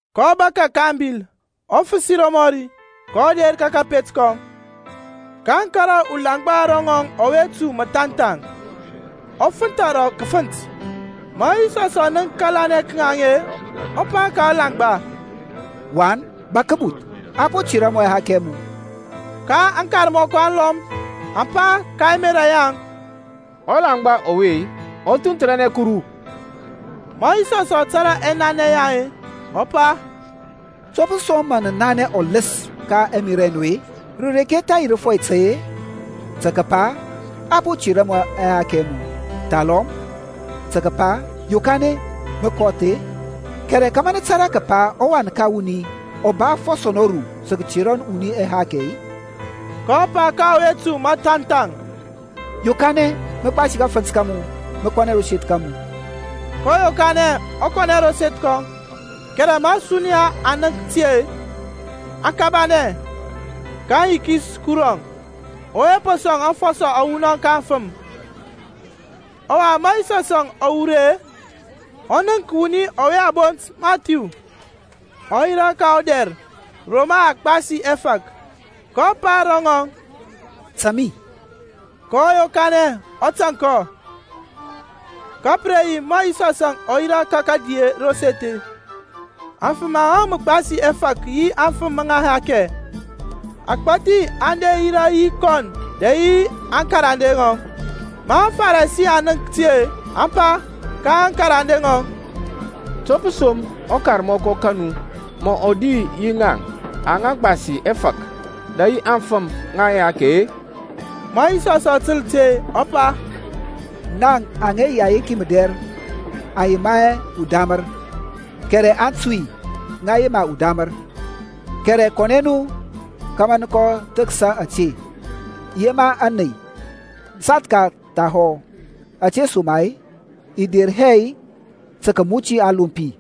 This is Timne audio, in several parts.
kɔ bȧkȧ ka abil, ɔ fǝsi romɔri, kɔ der ka kȧpet kɔŋ. Kaŋ kȧrȧ ulaŋgba ro ŋɔŋ ugbɛthkɛ ɔ fǝntha rǝ kǝfǝnt. Ma Yisɔs ɔ nənk kȧlanɛ ka ŋaŋ-e, ɔ pa ka ɔlaŋgba, Wan, bȧk kǝbuth. A po tera mu ɛhakɛ ɛ mu. Ka aŋkarmɔkɔ alɔm aŋ pa ka ɛmerȧ yaŋ, Ɔlaŋgba ɔwe ɔ thunthǝra Kuru. Ma Yisɔsȧŋ ɔ tȧrȧ ɛnanɛ yaŋ-e, ɔ pa, To pǝ som mǝ nǝ nanɛ ɔlǝs ka ɛmerȧ ɛ nu-e? Rǝ reke tha yi rǝfɔi tai-e, tǝ kǝpa, A po tera mu ɛhakɛ ɛ mu, thalɔm tǝ kǝpa, Yokanɛ, mǝ kɔth-e? Kɛrɛ kȧmȧ nǝ tȧrȧ kǝpa ɔWan ka wuni ɔ ba afɔsɔ nɔru tǝ kǝtera wuni ɛhakɛ-e, (kɔ pa ka ɔwe po gbɛthǝkɛ-e) Yokanɛ, mǝ gbasi kafǝnt ka mu, mǝ kɔ ro seth ka mu. kɔ yokanɛ, ɔ kɔnɛ ro seth kɔŋ. Kɛrɛ ma ȧsuniya aŋ nənk ti-e, aŋ kabanɛ, kaŋ yikis Kuruȧŋ ɔwe po sɔŋ afɔsɔ awunɔŋ ka afǝm. Ɔwa ma Yisɔsȧŋ ɔ wur ri-e, ɔ nənk wuni ɔwe a bont Mathiu, ɔ yirȧ ka ɔdɛr ro mǝ a gbasi ɛfȧk. Kɔ pa ro rɔŋɔŋ, Taŋ mi. Kɔ yokanɛ, ɔ tȧŋ kɔ. Ka pǝ re yi ma Yisɔsȧŋ ɔ yirȧ ka kǝdi ro seth-e, afǝm aŋa gbasi ɛfȧk yi afǝm ŋa ɛhakɛ agbȧthi aŋ der aŋ yirȧ yi kɔn dɛ yi aŋkarande ŋɔŋ. Ma aŋFarisi aŋ nənk ti-e, aŋ pa ka aŋkarande ŋɔŋ, To pǝ som ɔkarmɔkɔ ka nu mǝ ɔ di yi ŋaŋ aŋa gbasi ɛfȧk dɛ yi afǝm ŋa ɛhakɛ-e? Ma Yisɔsȧŋ ɔ tǝl ti-e, ɔ pa, Ŋaŋ aŋa yi ayenki mǝdɛr aŋ yema hɛ udamǝr, kɛrɛ aŋtui ŋa yema udamǝr. Kɛrɛ kɔnɛ nu kȧmȧ nǝ kɔ thǝkǝs ȧte, I yema ȧney, sathka thahɔ; ȧtesoma-e i der hɛ tǝ kǝmuti aŋlompi-e,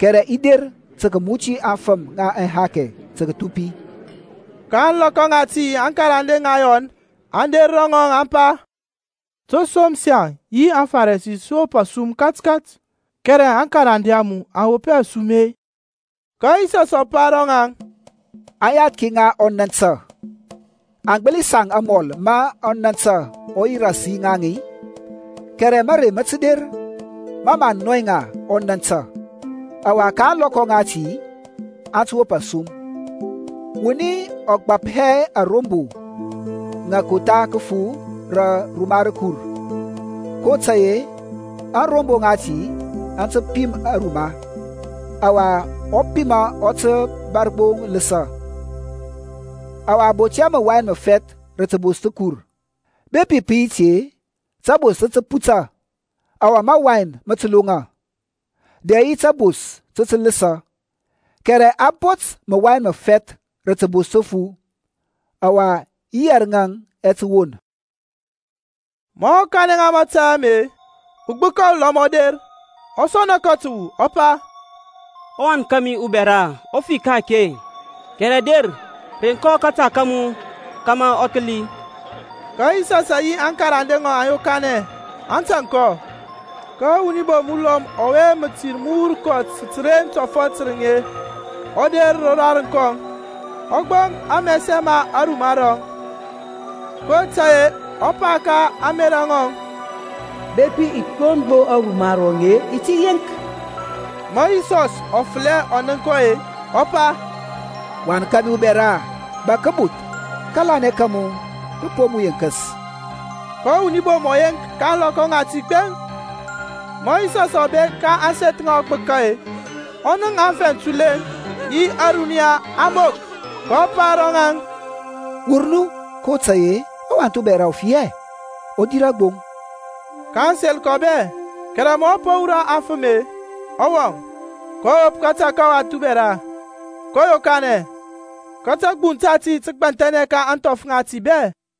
kɛrɛ i der tǝ kǝmuti aŋfǝm ŋa ɛhakɛ tǝ kǝthupi. Ka ȧŋlɔkɔ ŋati aŋkarande ŋa Yɔn aŋ der ro ŋɔŋ, aŋ pa, To som saŋ yi aŋFarisi sǝ wop asum katkat, kɛrɛ aŋkarande a mu aŋ wop hɛ asum-e? Ka Yisɔsȧŋ ɔ pa ro ŋaŋ, Aŋyathki ŋa ɔnȧntȧ aŋ gbǝli saŋ amɔl ma ɔnȧntȧ ɔ yi ras yi ŋaŋ-i? Kɛrɛ mȧrey mǝ tǝ der ma mǝ a nɔy ŋa ɔnȧntȧ, ɔwa ka ȧŋlɔkɔ ŋati aŋ tǝ wop asum. Wuni ɔ gbap hɛ arombo ŋa kotha kǝfu rǝ ruma rǝkur, kotȧy-e ȧŋrombo ŋati aŋ tǝ pim aruma, ɔwa ɔpima ɔ tǝ bȧr gbo lǝsǝ. Ɔwa a bot hɛ mǝwain mǝfɛth rǝ tǝbos tǝkur; bepi pǝ yi ti-e, tabos tǝ tǝ puta, ɔwa mawain mǝ tǝ loŋa, dɛ yi tabos tǝ tǝ lǝsǝ; kɛrɛ a bot mǝwain mǝfɛth rǝ tǝbos tǝfu, ɔwa yi yɛrǝŋ ɛ tǝ won. Ma ɔ kanɛ ŋa mȧtȧy ame-e, ugbǝka ulɔm ɔ der, ɔ sɔna kɔ tǝwu, ɔ pa, Ɔwan kȧmi ubɛra ɔ fi ka-ake, kɛrɛ der reŋ kɔ kȧta kȧmu kȧmȧ ɔ tǝ kǝli. Ka Yisɔsȧŋ yi aŋkarande ŋɔŋ aŋ yokanɛ, aŋ tȧŋ kɔ. Ka wuni bom ulɔm ǝŋbɔwurnɛ mǝtir ta tǝren tɔfɔt tǝrǝŋ-e, ɔ der rodarǝŋ kɔŋ, ɔ gboŋ amɛsɛ ma aruma rɔŋ. kotȧy-e ɔ pa ka ȧŋmerȧ ŋɔŋ, Bepi i gboŋ gbo aruma rɔŋ-e, i ti yeŋk. Ma Yisɔs ɔ fǝlɛ ɔ nənk kɔ-e, ɔ, pa, Wan ka mi ubɛra, bȧk kǝbuth. Kȧlanɛ kȧmu kǝ po mu yeŋkǝs. Ka ɔwuni bom ɔ yeŋk ka ȧŋlɔkɔ ŋati gbeŋ. Ma Yisɔsȧŋ ɔ bek ka ȧŋseth ŋa ɔgbǝka-e, ɔ nənk aŋfɛŋ tulɛŋ yi ȧruniya aŋ bok, kɔ pa ro ŋaŋ, Wur nu kotȧy-e ɔwath ubɛra ɔ fi hɛ, ɔ dirȧ gbo. Kaŋ sel kɔ bɛ. Kɛrɛ ma a po wurɔ aŋfǝm-e, ɔ wɔŋ, kɔ wop kȧta ka ɔwath ubɛra, kɔ yokanɛ. Ka tȧgbuŋ tati tǝ gbanthɛnɛ ka ȧŋthɔf ŋati bɛ.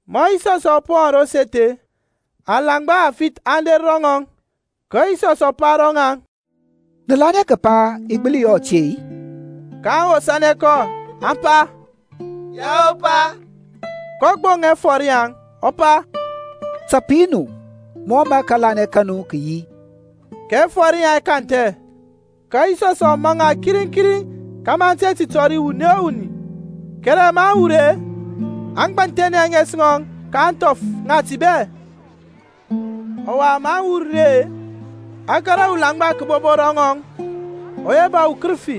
Ma Yisɔsȧŋ ɔ po wɔŋ ro seth-e, aŋlaŋgba afith aŋ der ro ŋɔŋ. Ka Yisɔs ɔ pa ro ŋaŋ, Nǝ lanɛ kǝpa i gbǝli yɔ ȧte-i? kaŋ wosȧnɛ kɔ, aŋ pa, Yao Pa. kɔ gboŋ ɛfɔr yaŋ, ɔ pa, Ta pǝ yi nu mɔ mǝ kȧlanɛ ka nu kǝ yi. Ka ɛfɔr yaŋ ɛ kanthɛ. Ka Yisɔsȧŋ ɔ maŋ ŋa kiriŋ kiriŋ kȧmȧ aŋ te ti tɔri wuni o wuni. Kɛrɛ maŋ wur-e, aŋ gbanthɛnɛ ȧŋes ŋɔŋ ka ȧŋthɔf ŋati bɛ. Ɔwa maŋ wur ri-e, a kȧrȧ ulaŋgba kǝbobo ro ŋɔŋ ɔwe ba ukǝrǝfi.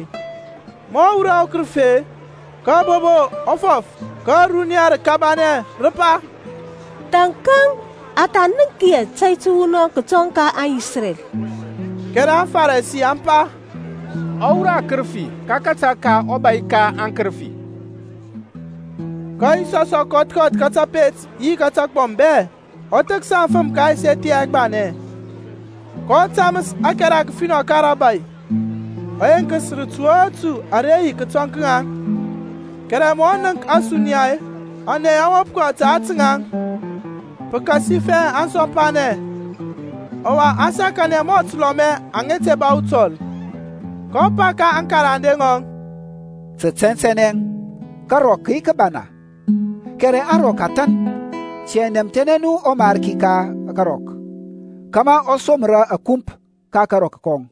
Ma ɔ wurɔ ɔkǝrǝfi-e, kabobo ɔ fɔf, ka ȧruniya rǝ kabanɛ, rǝ pa, Thȧnkȧŋ a tha nənk hɛ tȧy tǝwunɔŋ kǝtɔŋ ka aŋIsrɛl. Kɛrɛ aŋFarisi aŋ pa, Ɔ wurɔ akǝrǝfi ka kȧta ka ɔbȧy ka aŋkǝrǝfi. Ka Yisɔs ɔ kɔth kɔth ka tapet yi ka tagbɔm bɛ, ɔ thǝksa aŋfǝm ka ɛseth yaŋ ɛgbanɛ, kɔ tamǝs ȧkɛra kǝfinɔ ka rȧbȧy, ɔ yeŋkǝs rǝtu o rǝtu ara yi kǝtɔŋ ka ŋaŋ. Kɛrɛ ma ɔ nənk ȧsuniya-e, ȧney aŋ wop kɔ ta ȧtǝ ŋaŋ, pǝkasifɛ aŋ sɔmpanɛ, ɔwa aŋ sakanɛ mɔ tǝlɔmɛ aŋa te ba utɔl. kɔ pa ka aŋkarande ŋɔŋ, Tǝ tɛntɛnɛ karɔk kǝ yi kǝbana, kɛrɛ aŋrɔk a than. Tiyȧŋ nɛmthɛnɛ nu ɔMarki ka karɔk, kȧmȧ ɔ somra akump ka karɔk kɔŋ.